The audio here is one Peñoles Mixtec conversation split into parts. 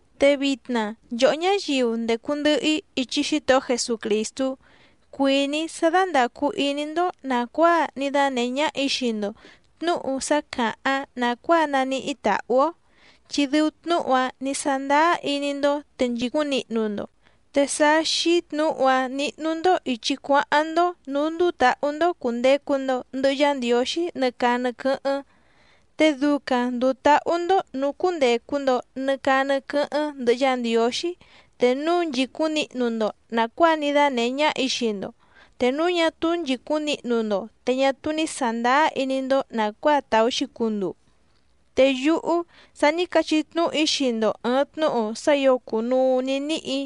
Te vitna nchòhó ñáyiu ndècu ndɨhɨ‑í ichi Xítohó Jesucrìstú cuìní‑í sá dándàcu iní‑ndó nàcuáa ní dánèhé ñáhà‑í xii‑ndo tnǔhu sá càháⁿ nàcuáa naníhí tàhú‑ó, chi dɨu tnúhu‑áⁿ nǐ sándáá iní‑ndó te nchìcúⁿ nihnu‑ndo. Te sá xíí tnǔhu‑áⁿ níhnú‑ndó ìchi cuáháⁿ‑ndó nǔú ndúú tǎhú‑ndó cùndecu‑ndo ndɨhɨ Yá Ndiǒxí nɨ caa nɨ quɨ́hɨ́ⁿ, te ducaⁿ ndùu táhú‑ndó nǔú cúndècu‑ndo nɨ caa nɨ quɨ́hɨ́ⁿ ndɨhɨ Yá Ndiǒxí te núu nchìcúⁿ nihnu‑ndo nàcuáa ní dánèhé ñáhà‑í xii‑ndo, te núu ñá túú nchìcúⁿ nihnu‑ndo te ñá túú ní sàndáá iní‑ndó nàcuáa tàú‑xi cunduu. Te yúhú sa ní cachí tnúhu‑í xii‑ndo ɨ̀ɨⁿ tnúhu sá ǐo cùnuu ní níhì‑í,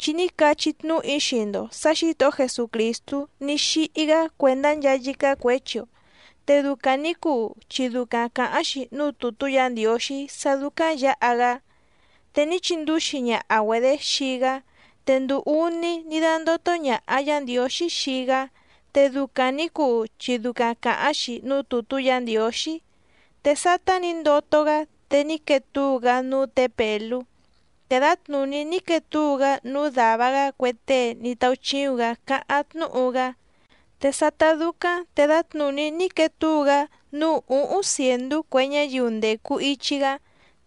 chi ní cachí tnúhu‑í xii‑ndo sǎ Xǐtohó Jesucrìstú ní xíhí‑gá cuèndá nchaa yícá cuěchi‑o, te ducaⁿ nǐ cuu chi ducaⁿ càháⁿ‑xi núú tùtú Yǎ Ndiǒxí sá dúcáⁿ yǎha‑gá. Te ní chindúxi ñaha‑güedě xii‑gá te nduu úní ní dándótó ñàha Yá Ndiǒxí xii‑gá, te ducaⁿ nǐ cuu chi ducaⁿ càháⁿ‑xi núú tùtú Yǎ Ndiǒxí. Te sátá nǐ ndoto‑gá te ní quee túu‑gá núú tě Pèlú, te dǎtnùní ní quee túu‑gá núú dàva‑gá cue tée ní táúchíúⁿ‑gǎ cáháⁿ tnúhu‑gá. Te sátá dúcáⁿ te dǎtnùní ní quee túu‑gá núú ǔhúⁿ cièndú cue ñáyiu ndècu ichi‑gá,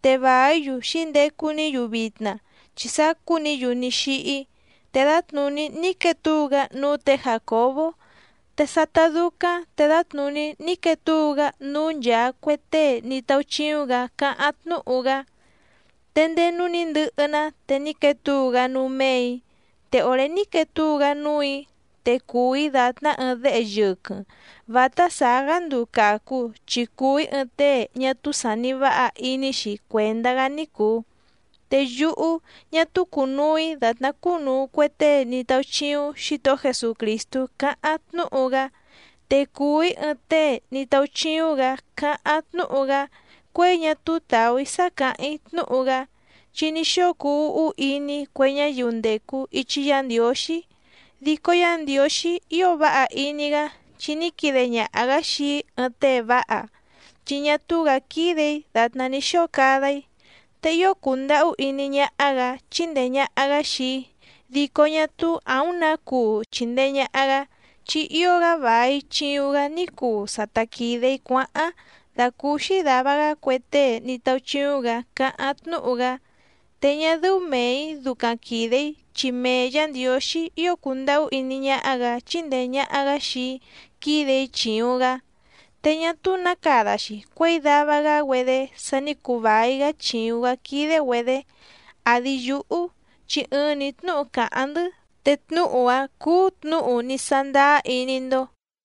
te vàí‑yu xǐndecu‑ní‑yu vitna chi sacú‑ni‑yu ní xíhí. Te dǎtnùní ní quee túu‑gá núú tě Jàcobó, te sátá dúcáⁿ te dǎtnùní ní quee túu‑gá núú nchaa cue tée ní táúchíúⁿ‑gǎ cáháⁿ tnúhu‑gá. Te ndéé núú nǐ ndɨhɨ‑ná te ní quee túu‑gá núú méè‑í, te òré ní quee túu‑gá núù‑í te cùu‑í dàtná ɨɨⁿ déhe yɨquɨⁿ vǎtá sàá‑gá nduu càcu chi cùu‑í ɨɨⁿ tée ñá túú sàni váha iní‑xi cuèndá‑gá ní cùu. Te yúhú ñá túú cùnuu‑í dàtná cúnùu cue tée ní táúchíúⁿ Xǐtohó Jesucrìstú cáháⁿ tnúhu‑gá. Te cùu‑í ɨɨⁿ tée ní táúchíúⁿ‑gǎ càháⁿ tnúhu‑gá, cuěi ñá túú tàú‑í sá càháⁿ‑í tnúhu‑gá, chi ní xóo cuu úhú iní‑í cue ñáyiu ndècu ichi Yá Ndiǒxí. Dico Yá Ndiǒxí ío váha iní‑gá chi ní quide ñaha‑gǎ xii‑í ɨɨⁿ tée váha, chi ñá túú‑gǎ quídè‑í dàtná ní xóo cada‑í. Te ío cùndahú iní ñáhá‑gǎ chíndèe ñaha‑gá xii‑í dico ñá túú àúⁿ nǎ cuu chìndee ñaha‑gá, chi ío‑gá vài chiuⁿ‑gá ní cuu sa ta quìde‑í cuáháⁿ dàcúúxí dàva‑gá cue tée ní táúchíúⁿ‑gǎ cáháⁿ tnúhu‑gá te ñá dɨ́ú mèe‑í ducaⁿ quìde‑í chi mee Yǎ Ndiǒxí ío cùndahú iní ñáhá‑gǎ chíndèe ñaha‑gá xii‑í quídè‑í chìuⁿ‑gá. Te ñá túú nǎ cada‑xi cuěi dava‑gá‑güedé sa ní cuu vài‑gá chìuⁿ‑gá quídé‑güedě àdi yúhú, chi ɨɨⁿ‑ni tnúhu càháⁿ‑ndɨ́ te tnúhu‑áⁿ cúú tnǔhu ní sándáá iní‑ndó.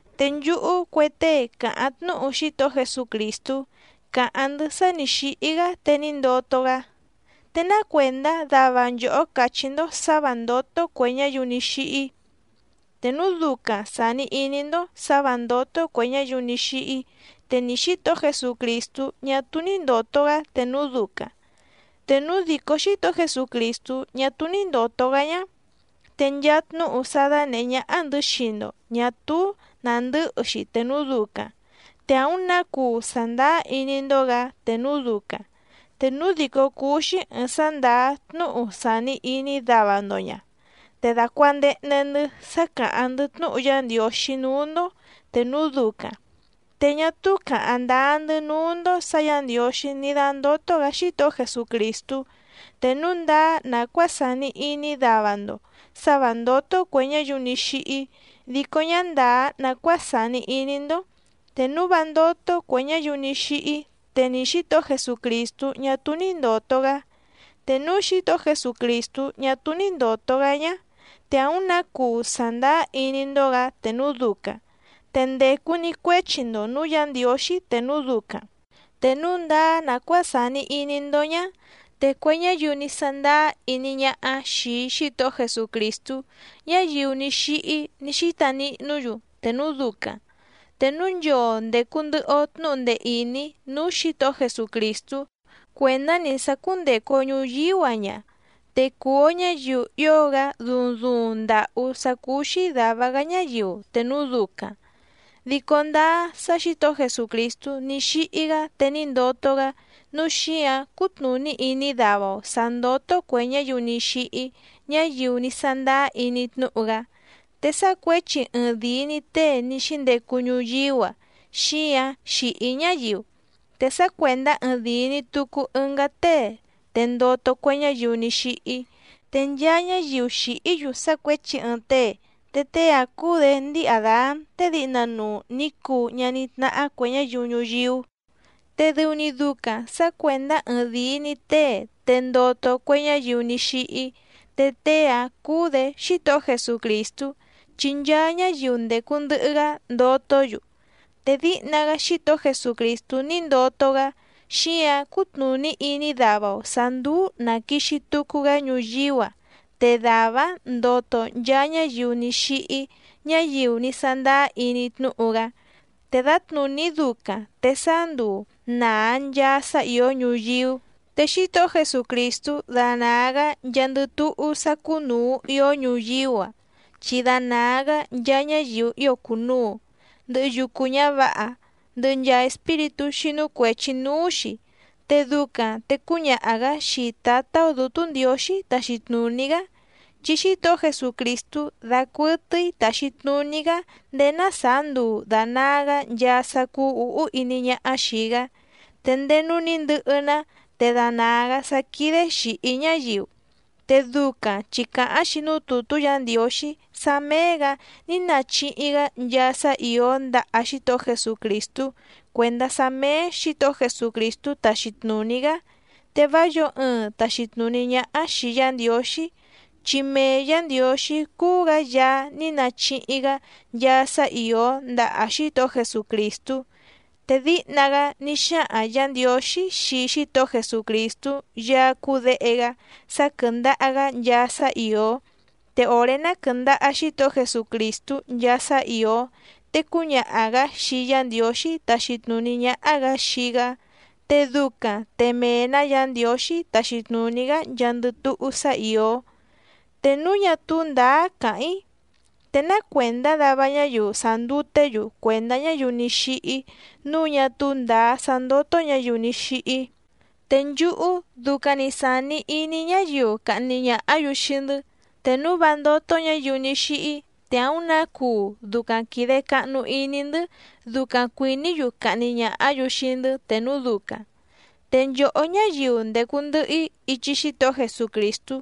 Te nchúhú cue tée càháⁿ tnúhu Xítohó Jesucrìstú càháⁿ‑ndɨ́ sá nǐ xíhí‑gá te ní ndoto‑gá, ¿te ná cuèndá dava nchòhó càchí‑ndó sǎ vǎ ndótó cuè ñáyiu ní xíhí? Te núu ducaⁿ sàni iní‑ndó sǎ vǎ ndótó cuè ñáyiu ní xíhí te ni Xǐtohó Jesucrìstú ñá túú ní ndòto‑gá te núu ducaⁿ. Te núu dìcó Xítohó Jesucrìstú ñá túú ní ndòto‑gá ñá, te nchaa tnúhu sá dánèhé ñáhá‑ndɨ̌ xii‑ndo ñà túú nàndɨ́hɨ‑xi te núu ducaⁿ, te àúⁿ nǎ cuu sàndáá iní‑ndó‑gǎ te núu ducaⁿ. Te núu dìcó cúú‑xí ɨ̀ɨⁿ sá ndàá tnúhu sàni iní dava‑ndo ña, te dàcuandehnde‑ndɨ́ sá càháⁿ‑ndɨ́ tnúhu Yá Ndiǒxí núú‑ndó te núu ducaⁿ, te ñá túú càháⁿ ndáá‑ndɨ́ núú‑ndó sǎ Yǎ Ndiǒxí ní dándótó‑gǎ Xítohó Jesucrìstú, te núu ndáá nàcuáa sàni iní dava‑ndo sǎ vǎ ndótó cuè ñáyiu ní xíhí, dico ñá ndàá nàcuáa sàni iní‑ndó. Te núu vá ndótó cuè ñáyiu ní xíhí te ni Xǐtohó Jesucrìstú ñá túú ní ndòto‑gá. Te núu Xítohó Jesucrìstú ñá túú ní ndòto‑gá ñá, te àúⁿ nǎ cuu sàndáá iní‑ndó‑gǎ te núu ducaⁿ, te ndècu‑ni cuéchi‑ndo nǔú Yǎ Ndiǒxí te núu ducaⁿ. Te núu ndáá nàcuáa sàni iní‑ndó ñá te cue ñáyiu ní sándáá iní ñáhá xìi Xítohó Jesucrìstú ñáyiu ní xíhí ní xíta nihnú‑yu te núu ducaⁿ. Te núu nchoo ndècu ndɨhɨ‑o tnúhu ndee ìní núú Xǐtohó Jesucrìstú cuèndá‑ni sá cúndècu‑o ñuyíú‑a ña, te cùu‑o ñáyiu ío‑gá duuⁿ duuⁿ ndàhú sá cúú‑xí dàva‑gá ñáyiu te núu ducaⁿ. Dico ndáá sá Xǐtohó Jesucrìstú ní xíhí‑gá te ní ndoto‑gá nǔu xíǎⁿ cútnùní iní dava‑o sǎ ndótó cuè ñáyiu ní xíhí ñáyiu ní sándáá iní tnúhu‑gá. Te sá cuěchi ɨɨⁿdìi‑ni tée ní xíndecu ñuyíú‑a xíǎⁿ xìhí ñáyiu, te sá cuèndá ɨɨⁿdìi‑ni tucu ɨngá tée te ndoto cue ñáyiu ní xíhí. Te nchaa ñáyiu xìhí‑yu sá cuěchi ɨɨⁿ tée, te tée‑áⁿ cúú‑dě ndíi Àdán tée díhna nuu nǐ cuu ñaní tnáhá cuè ñáyiu ñuyíú. Te dɨu‑ni ducaⁿ sǎ cuèndá ɨɨⁿdìi‑ni tée te ndoto cue ñáyiu ní xíhí, te tée‑áⁿ cúú‑dě Xítohó Jesucrìstú chi nchaa ñáyiu ndècu ndɨhɨ‑gá ndotó‑yu. Te díhna‑gá Xítohó Jesucrìstú ní ndoto‑gá xíǎⁿ cútnùní iní dava‑o sǎ ndùu na quixi tucu‑gá ñuyíú‑a te dàvá‑áⁿ ndoto nchaa ñáyiu ní xíhí ñáyiu ní sándáá iní tnúhu‑gá. Te dǎtnùní ducaⁿ te sáá nduu nàa nchaa sá ìó ñuyíú, te Xítohó Jesucrìstú danàa‑gá nchaa ndɨ túhú sá cúnùu ió ñuyíú‑a, chi danàa‑gá nchaa ñáyiu ío cùnuu, ndɨhɨ yucu ñǎvǎha, ndɨhɨ nchaa espíritú xínú cuèchi núú‑xi. Te ducaⁿ te cúñaha‑gǎ xii Tǎtá‑ó Dǔtú Ndiǒxí taxi tnùní‑gá. Chi Xítohó Jesucrìstú dacuɨtɨ́í tàxi tnuní‑gá ndéé ná sàá nduu dànaa‑gá nchaa sá cúú ǔhú iní ñáhá xìi‑gá. Te ndéé núú nǐ ndɨhɨ‑ná te danàa‑gá sá quídé xìhí ñáyiu. Te ducaⁿ chi càháⁿ‑xi núú tùtú Yǎ Ndiǒxí sá méé‑gǎ ní nachihi‑gá nchaa sá ìó ndaha Xítohó Jesucrìstú cuèndá sá méé Xǐtohó Jesucrìstú taxi tnùní‑gá, te vá yǒo ɨɨⁿ tàxi tnuní ñáhá xìi Yá Ndiǒxí, chi mee Yǎ Ndiǒxí cúú‑gǎ Yaá ní nachihi‑gá nchaa sá ìó ndaha Xítohó Jesucrìstú. Te díhna‑gá ní xáhaⁿ Yǎ Ndiǒxí xii Xítohó Jesucrìstú Yaá cúú Děhe‑gá sá quɨ́ndàha‑gá nchaa sá ìó, te òré ná quɨ̀ndaha Xítohó Jesucrìstú nchaa sá ìó, te cúñaha‑gǎ xii Yá Ndiǒxí taxi tnùní ñáhá‑gǎ xii‑gá, te ducaⁿ te mee‑nǎ Yǎ Ndiǒxí taxi tnùní‑gá nchaandɨ túhú sá ìó. Te núu ñá túú ndǎá càháⁿ‑í, ¿te ná cuèndá dava ñáyiu sànduté‑yu cuèndá ñáyiu ní xíhí nǔu ñá túú ndǎá sá ndótó ñǎyiu ní xíhí? Te nchúhú ducaⁿ‑ni sàni iní ñáyiu cahni ñàhá‑yu xii‑ndɨ́, te núu vá ndótó ñǎyiu ní xíhí te àúⁿ nǎ cuu ducaⁿ quìde cahnu iní‑ndɨ́ ducaⁿ cuìní‑yu cahni ñàhá‑yu xii‑ndɨ́ te núu ducaⁿ. Te nchòhó ñáyiu ndècu ndɨhɨ‑í ichi Xítohó Jesucrìstú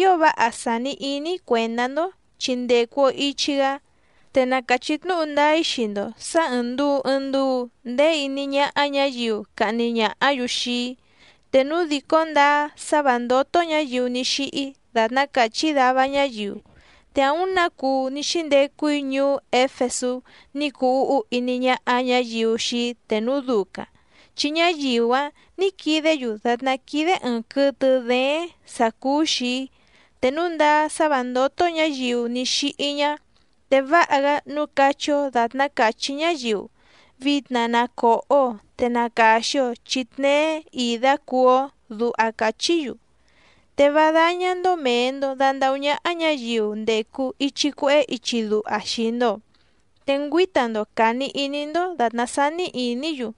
ío váha sàni iní‑í cuèndá‑ndó, chi ndècu‑o ichi‑gá. Te na càchí tnúhu ndáá‑í xii‑ndo sǎ ɨ̀ɨⁿ nduu ɨɨⁿ nduu ndeé iní ñáhá ñǎyiu cahni ñàhá‑yu xii‑í. Te núu dìcó ndáá sá vǎ ndótó ñǎyiu ní xíhí dàtná càchí dava ñáyiu, te àúⁿ nǎ cuu ní xíndecu‑í ñuú Éfesú ní cuu úhú iní ñáhá ñǎyiu xii‑í te núu ducaⁿ, chi ñáyiu‑áⁿ nǐ quidé‑yu dàtná quídé ɨ̀ɨⁿ quɨtɨ dééⁿ sǎ cúú‑xì‑í. Te núu ndáá sá vǎ ndótó ñǎyiu ní xíhí ñá, te váha‑gá nǔu cachí‑ó dàtná càchí ñáyiu: “Vitna na còho‑o te na càxi‑o chi tneé ìdá cuú‑ó”, duha càchí‑yu. Te vá dáñá‑ndó mèe‑ndo dandahú ñáhá ñǎyiu ndècu ichi cuehé ichi duha xii‑ndo, te ngüíta‑ndo càni iní‑ndó dàtná sání ìní‑yu.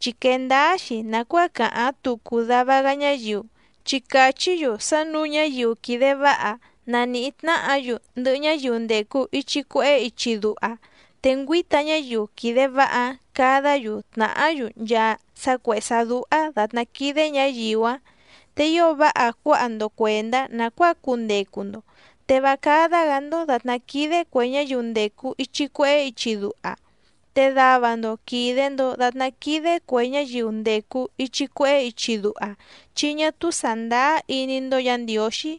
Chi quèe ndáá‑xi nàcuáa càháⁿ tucu dava‑gá ñáyiu, chi càchí‑yu sá nǔu ñáyiu quìde váha na nìhí tnáhǎ‑yu ndɨhɨ ñáyiu ndècu ichi cuehé ichi duha, te ngüǐta ñáyiu quìde váha‑áⁿ cadá‑yu tnàhá‑yu nchaa sá cuèhé sá dúhá dàtná quídé ñǎyiu‑áⁿ. Te ío váha cuáha‑ndo cuèndá nàcuáa cundecu‑ndo, te vá cádá‑gǎ‑ndó dàtná quídé cuè ñáyiu ndècu ichi cuehé ichi duha. Te dava‑ndo quìde‑ndo datná quídé cuè ñáyiu ndècu ichi cuehé ichi duha chi ñá túú sàndáá iní‑ndó Yǎ Ndiǒxí.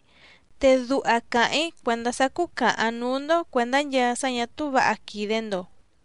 Te duha càháⁿ‑í cuèndá sá cúcàhaⁿ núú‑ndó cuèndá nchaa sá ñà túú vǎha quìde‑ndo.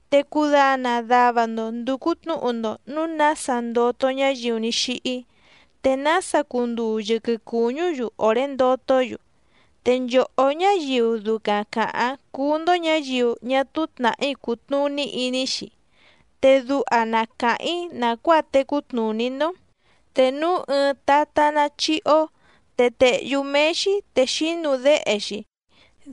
Te cudana dava‑ndo ndùcu tnúhu‑ndo nǔu nása ndoto ñáyiu ní xíhí, te nása cunduu yɨquɨ cùñú‑yu òré ndotó‑yu. Te nchòhó ñáyiu ducaⁿ càháⁿ cúú‑ndó ñǎyiu ñá túú tnàhí cùtnuní iní‑xi, te duha na càháⁿ‑í nàcuáa tecú tnùní‑ndó. Te núu ɨɨⁿ tatá ná chíhí‑ó te tèhyú méé‑xí te xínu déhe‑xi.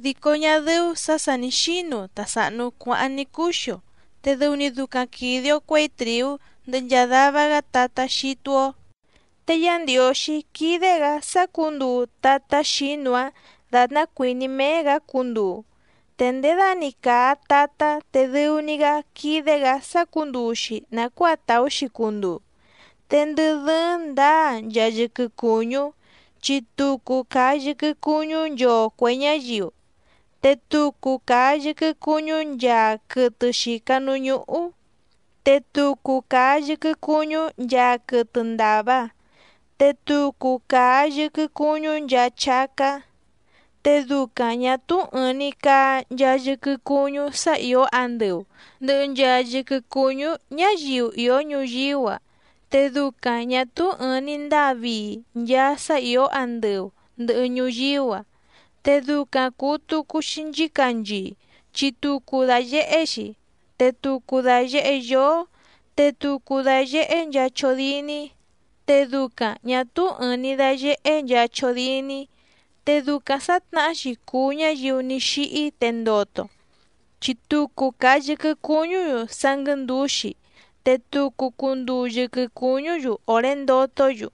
Dico ñá dɨ́ú sǎ sà ní xínu ta sàhnu cuáháⁿ ní cǔxi‑o, te dɨu‑ni ducaⁿ quìde‑o cuéi trìú ndɨhɨ nchaa dava‑gá tatá xítú‑ó. Te Yá Ndiǒxí quídé‑gǎ sácǔnduu tatá xǐnu‑áⁿ dàtná cuìní méé‑gǎ cunduu. Te nděda‑ni càa tatá te dɨu‑ni‑gá quídé‑gǎ sácǔnduu‑xi nàcuáa tàú‑xi cunduu. Te ndɨ dɨ́ɨ́ⁿ ndǎa nchaa yɨquɨ cùñú, chi tucu càa yɨquɨ cuñú nchoo cuè ñáyiu, te tucu càa yɨquɨ cuñú nchaa quɨtɨ xìca núú ñúhú, te tucu càa yɨquɨ cuñú nchaa quɨtɨ ndàva, te tucu càa yɨquɨ cuñú nchaa chácá. Te ducaⁿ ñà túú ɨ̀ɨⁿ‑ni caa nchaa yɨquɨ cuñú sá ìó andɨu ndɨ̀hɨ nchaa yɨquɨ cuñú ñáyiu ìó ñuyíú‑a, te ducaⁿ ñà túú ɨ̀ɨⁿ‑ni ndáa vii nchaa sá ìó andɨu ndɨ̀hɨ ñuyíú‑a. Te ducaⁿ cùu tucu‑xi nchícanchii chi tucu dàyehé‑xi, te tucu dàyehé yóó, te tucu dàyehé nchaa chódíní, te ducaⁿ ñà túú ɨ̀ɨⁿ‑ni dayehé nchaa chódíní. Te ducaⁿ sǎtnahá‑xi cùu ñáyiu ní xíhí te ndoto, chi tucu càa yɨquɨ cuñú‑yu sá nguɨ̌ndǔxi te tucu cunduu yɨquɨ cùñú‑yu òré ndotó‑yu,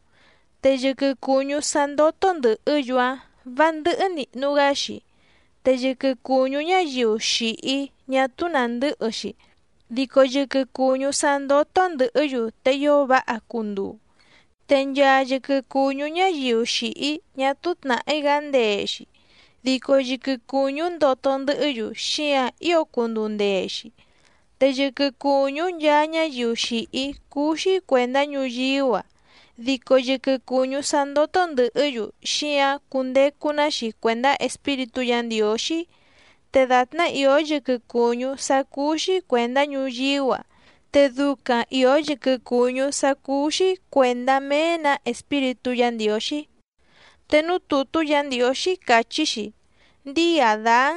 te yɨquɨ cùñú sá ndótó ndɨ̀hɨ́‑yu‑áⁿ vǎ ndɨ́hɨ́ nìhnu‑gá‑xi. Te yɨquɨ cùñú ñáyiu xìhí ñá túú nàndɨ́hɨ‑xi, dico yɨquɨ cùñú sá ndótó ndɨ̀hɨ́‑yu te ío váha cunduu. Te nchaa yɨquɨ cùñú ñáyiu xìhí ñá túú tnàhí‑gá ndee‑xi, dico yɨquɨ cùñú ndoto ndɨhɨ́‑yu xíǎⁿ ío cunduu ndee‑xi. Te yɨquɨ cùñú nchaa ñáyiu xìhí cúú‑xí cuèndá ñuyíú‑a, dico yɨquɨ cùñú sá ndótó ndɨ̀hɨ́‑yu xíǎⁿ cundecu‑ná‑xi cuèndá Espíritú Yǎ Ndiǒxí. Te dàtná ìó yɨquɨ cùñú sá cúú‑xí cuèndá ñuyíú‑a, te ducaⁿ ìó yɨquɨ cùñú sá cúú‑xí cuèndá mee‑nǎ Espíritú Yǎ Ndiǒxí. Te núú tùtú Yǎ Ndiǒxí càchí‑xi: “Ndíi Àdán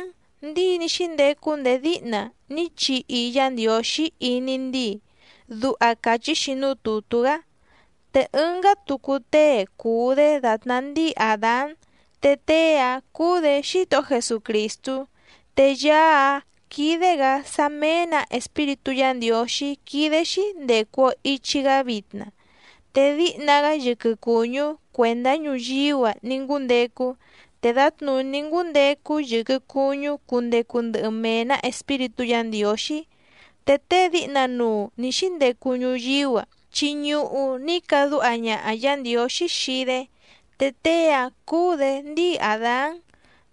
ndíi ní xíndecu ndéé díhna ní chihi Yá Ndiǒxí iní ndíi”, duha càchí‑xi núú tùtú‑gá. Te ɨngá tucu tée cùu‑dé dàtná ndíi Àdán te tée‑áⁿ cúú‑dě Xítohó Jesucrìstú, te Yaá‑áⁿ quídé‑gǎ sá mèe‑ná Espíritú Yǎ Ndiǒxí quídé‑xí ndècu‑o ichi‑gá vitna. Te díhna‑gá yɨquɨ cùñú cuèndá ñuyíú‑a ní ngúndecu, te dǎtnùní ngúndecu yɨquɨ cùñú cundecu ndɨhɨ mee‑nǎ Espíritú Yǎ Ndiǒxí. Te tée díhna nuu nǐ xíndecu ñuyíú‑a chi ñuhu ní cadúha ñaha Yǎ Ndiǒxí xii‑dé, te tée‑áⁿ cúú‑dě ndíi Àdán,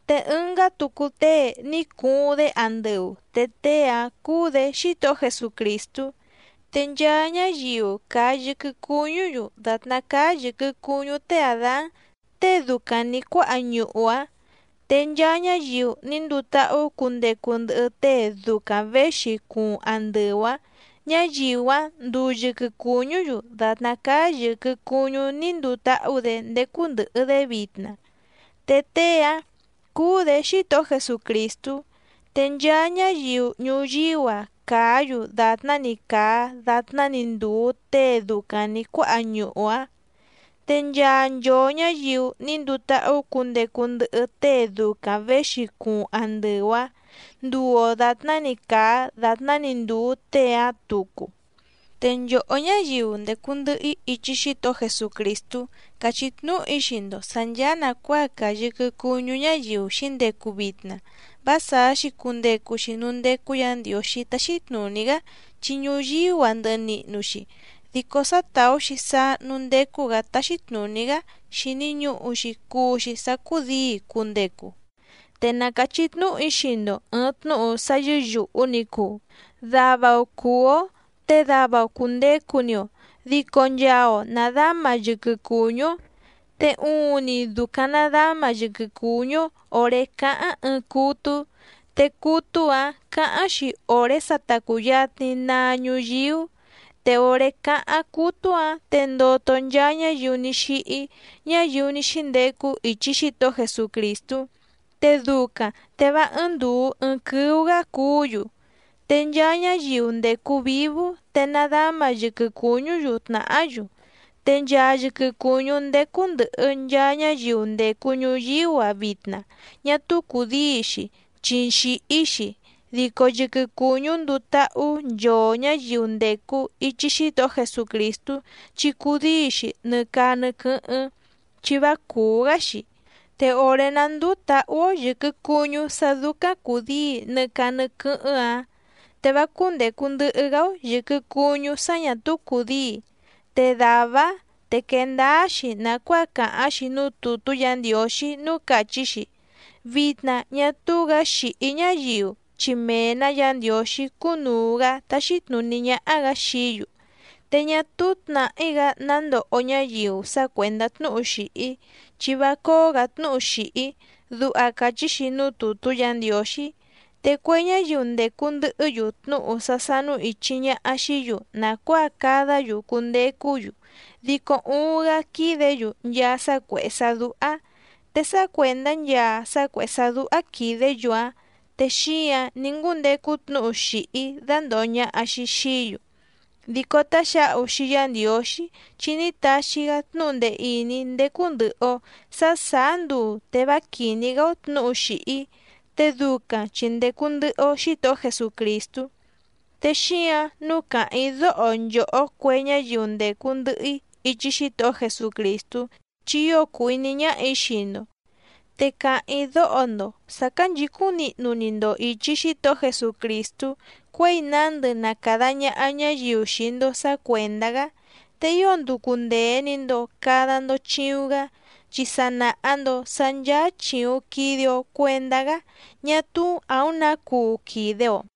te ɨngá tucu tée ní cuuⁿ‑dé andɨu te tée‑áⁿ cúú‑dě Xítohó Jesucrìstú. Te nchaa ñáyiu càa yɨquɨ cuñú‑yu dàtná cáá yɨ̀quɨ cuñú té Àdán tée ducaⁿ nǐ cuáha ñuhu‑áⁿ, te nchaa ñáyiu ní nduu táhú cundecu ndɨhɨ tée ducaⁿ věxi cuuⁿ andɨu‑áⁿ, ñáyiu‑áⁿ nduu yɨquɨ cùñú‑yu dàtná cáá yɨ̀quɨ cuñú ní nduu táhú‑dě ndécú ndɨ̀hɨ‑dé vitna, te tée‑áⁿ cúú‑dě Xítohó Jesucrìstú. Te nchaa ñáyiu ñuyíú‑a càá‑yu dàtná‑ni càa datná‑ni ndùu tée ducaⁿ nǐ cuáha ñuhu‑áⁿ. Te nchaa nchoo ñǎyiu ní nduu táhú cundecu ndɨhɨ tée ducaⁿ věxi cuuⁿ andɨu‑áⁿ nduu‑o dàtná‑ni càa datná‑ni ndùu tée‑áⁿ tucu. Te nchòhó ñáyiu ndècu ndɨhɨ‑í ichi Xítohó Jesucrìstú càchí tnúhu‑í xii‑ndo sǎ ncháá nàcuáa càa yɨquɨ cuñú ñáyiu xǐndecu vitna vá sàá‑xi cundecu‑xi núú ndécú Yǎ Ndiǒxí táxí tnùní‑gá, chi ñuyíú‑a ndɨhɨ nihnu‑xi. Dico sá tàú‑xi sáá núú ndécú‑gǎ táxí tnùní‑gá xìni ñuhu‑xi cuu‑xi sá cúdǐi cundecu. Te na càchí tnúhu‑í xii‑ndo ɨ̀ɨⁿ tnúhu sá yɨ́yùhu ni cuu: Dava‑o cùú‑ó te dava‑o cùndecu‑ni‑o, dico nchaa‑o nàdáma yɨquɨ cuñú‑ó. Te uuⁿni ducaⁿ nàdáma yɨquɨ cuñú‑ó òré cáháⁿ ɨɨⁿ cútú, te cútú‑ǎⁿ cǎháⁿ‑xi òré sa ta cùyatni naa ñuyíú. Te òré cáháⁿ cútú‑ǎⁿ te ndoto nchaa ñáyiu ní xíhí ñáyiu ní xíndecu ichi Xítohó Jesucrìstú, te ducaⁿ te vá ɨ́ɨ́ⁿ ndùu ɨɨⁿ quɨ́ú‑gǎ cuú‑yu. Te nchaa ñáyiu ndècu vívú te nàdáma yɨquɨ cuñú‑yu tnàhá‑yu. Te nchaa yɨquɨ cùñú ndécú ndɨ̀hɨ nchaa ñáyiu ndècu ñuyíú‑a vitna ñá túú cùdíi‑xi chi xìhí‑xi, dico yɨquɨ cùñú nduu táhú nchoo ñǎyiu ndècu ichi Xítohó Jesucrìstú chi cudíi‑xi nɨ caa nɨ quɨ́hɨ́ⁿ chi vá cùú‑gá‑xi. Te òré ná ndùu táhú‑ó yɨ̀quɨ cuñú sá dúcáⁿ cùdíi nɨ caa nɨ quɨ́hɨ́ⁿ‑áⁿ, te vá cúndècu ndɨhɨ‑gá‑ó yɨ̀quɨ cuñú sá ñà túú cùdíi. Te dàvá‑áⁿ te quee ndáá‑xi nàcuáa càháⁿ‑xi núú tùtú Yǎ Ndiǒxí núú càchí‑xi: “Vitna ñá túú‑gǎ xìhí ñáyiu chi mee‑nǎ Yǎ Ndiǒxí cúnùu‑gá táxí tnùní ñáhá‑gǎ xií‑yu. Te ñá túú tnàhí‑gá ná ndoho ñáyiu sá cuèndá tnúhu xìhí, chi vá cóó‑gǎ tnúhu xìhí”, duha càchí‑xi núú tùtú Yǎ Ndiǒxí. Te cue ñáyiu ndècu ndɨhɨ́‑yu tnúhu sá sánú ìchi ñaha xií‑yu nàcuáa cadá‑yu cundecú‑yu dico uuⁿ‑gá quídě‑yu nchaa sá cuèhé sá dúhá. Te sá cuèndá nchaa sá cuèhé sá dúhá quìdé‑yu‑áⁿ, te xíǎⁿ ní ngúndecu tnúhu xìhí dándòho ñaha‑xi xií‑yu. Dico táxǎhu xii Yá Ndiǒxí chi ní taxi‑gá tnúhu ndee ìní ndécú ndɨ̀hɨ‑o sá sàá nduu te vá quìní‑gá‑ó tnǔhu xìhí, te ducaⁿ chi ndècu ndɨhɨ‑o Xítohó Jesucrìstú. Te xíǎⁿ nǔu càháⁿ‑í dóho nchòhó cue ñáyiu ndècu ndɨhɨ‑í ichi Xítohó Jesucrìstú chi ío cùu iní ñáhà‑í xii‑ndo, te càháⁿ‑í dóho‑ndo sǎ cánchǐcúⁿ nihnu‑ni‑ndo ìchi Xítohó Jesucrìstú cuěi nándɨ na càda ñaha ñáyiu xii‑ndo sǎ cuèndá‑gá, te ío nducu ndèe‑ni‑ndo cada‑ndo chiuⁿ‑gá, chi sa nàha‑ndo sá ncháá chìuⁿ quide‑o cuendá‑gá ñá túú àúⁿ nǎ cuu quìde‑o.